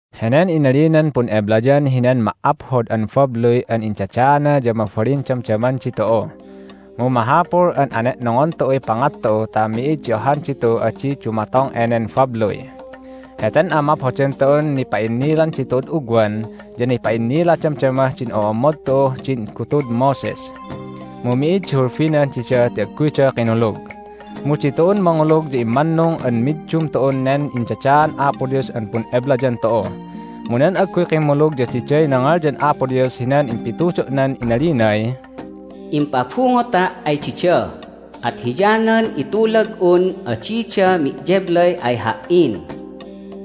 Henen inalinan pun'eblayan hinan ma"aphod an babluy an indadaana ya mabalin damdaman ditu'u. Mu mahapul an ane'nongon tu'uy pangat tu'u ta mi'id di ohan ditu'uh adi dumatong enen babluy! Heten amaphodan tu'un nipa'innilan ditu'ud ugwan ya nipa'innila damdamah din o'ommod tu'uh din gutud Moses. Mu mi'id di hulbinan dida ti agguyda kinulug. Mu ditu'un mangulug ya immannung an middum tu'un nen indadaan Apo Dios an pun'eblayan tu'u. Mu nan agguy kimmulug ya diday nangalyan Apo Dios hinan impitudo'nan inalinay, "Impabungota' ay dida, at hiyanan itulag'un adida me'yeblay ay Ha"in!"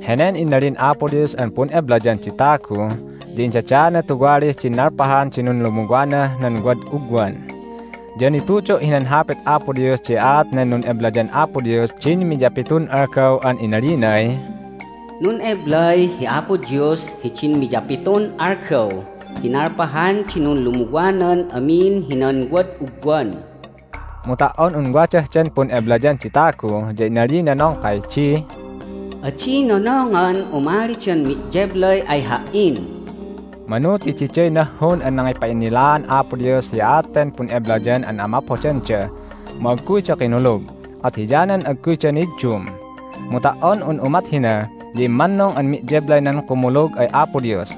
Henen inalin Apo Dios an pun'eblayan di tagu ya indadaana tuwalih din nalpahan di nunlumuwanah nan wad ugwan. Ya nitudo' hinan Hapit Apo Dios di aat nan nun'eblayan Apo Dios din miyapitun algaw an inalinay, "Nun'eblay hi Apo Dios hidin miyapitun algaw hi nalpahan di nunlumuwanan amin hinan wad ugwan." Mu ta"on un wadah den pun'eblayan di tagu ya inalina nongkay di, "Adi nonongan umalidan me'yeblay ay Ha"in." Manu ti diday nahhun an nangipa'innilaan Apo Dios hi aat ten pun'eblayan an amaphodanda, mu agguyda kinulug, at hiyanan agguyda niddum. Mu ta"on un umat hina ya immannung an me'yeblay nan kumulug ay Apo Dios.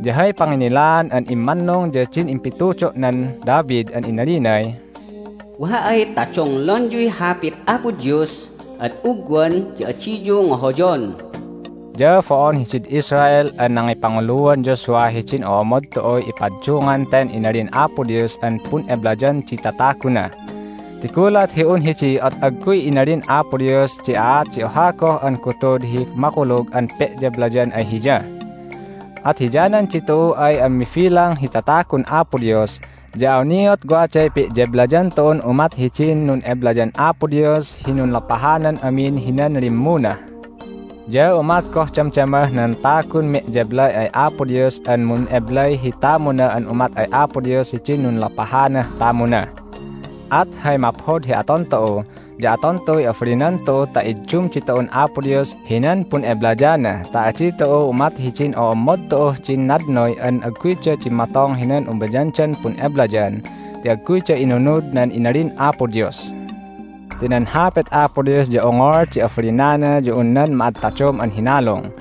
Ya hay panginnilaan an immannung ya din impitudo'nan David an inalinay, "Wa ay ta donglonyuy Hapit Apo Dios ad ugwan ya adiyu ngohoyon." Ya bo'on hidid Israel an nangipanguluan Joshua hidin o'ommod tu'uy ipaddungan ten inalin Apo Dios an pun'eblayan di tataguna. Ti gulat hi un hidi at agguy inalin Apo Dios di aat di oha goh an gutud hi makulug an pe'yeblayan ay Hiya. At hiyanan ditu'u ay an mibilang hi tatagun Apo Dios ya awniat waday pe'yeblayan tu'un umat hidin nun'eblayan Apo Dios hi nunlopahanan amin hinan limmuna. Ya umat goh damdamah nan tagun me'yeblay ay Apo Dios an mun'eblay hi tamuna an umat ay Apo Dios hidin nunlopahanah tamuna. At hay maphod hi aton tu'u ya aton tu'uy abalinan tu'u ta iddum ditu'un Apo Dios hinan pun'eblayana ta adi tu'u umat hidin o'ommod tu'uh din nadnoy an agguyda dimmatong hinan umayandan pun'eblayan ti agguyda inunud nan inalin Apo Dios. Ti nan Hapit Apo Dios ya ongol di abalinana ya un nan ma'ataddom an hinalung.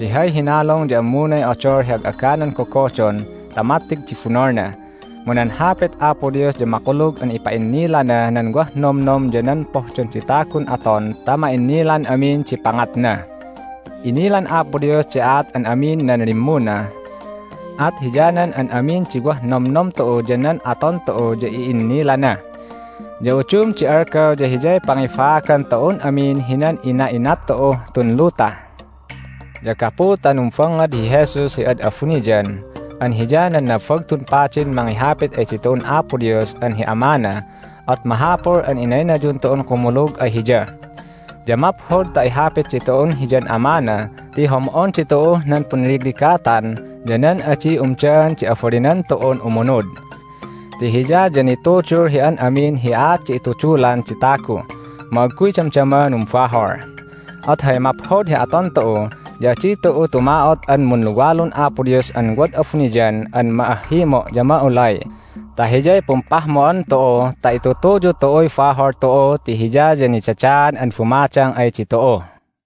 Ti hay hinalung ya ammunay odol hi ag'aganan gogodon ta mattig di bunolna. Mu nan Hapit Apo Dios ya makulug an ipa'innilana nan wah nomnom ya nan pohdon di tagun aton ta ma'innilan amin di pangatna. Inilan Apo Dios di aat an amin nan limmuna. At hiyanan an amin di wah nomnom tu'u ya nan aton tu'u ya i'innilana. Ya udum di algaw ya Hiyay pangibaagan tu'un amin hinan ina'inat tu'uh tun luta. Ya gapu ta numbangngad hi Jesus hi ad abuniyan an Hiya nan Nabagtun Padin mangihapit ay ditu'un Apo Dios an hi Amana at mahapul an inaynayun tu'un kumulug ay Hiya. Ya maphod ta ihapit ditu'un Hiyan Amana ti hom'on ditu'uh nan punligligatan ya nan adi umdaan di abalinan tu'un umunud. Ti Hiya ya nitudul hi an amin hi aat di itudulan di tagu, mu agguy damdama numbahol. At hay maphod hi aton tu'u ya adi tu'u tuma'ot an munluwalun Apo Dios an wad abuniyan an ma'ahhimo' ya ma'ulay ta Hiyay pumpahmo'an tu'u ta itutuyu tu'uy bahol tu'u ti Hiya ya nidadaan an bumadang ay ditu'u.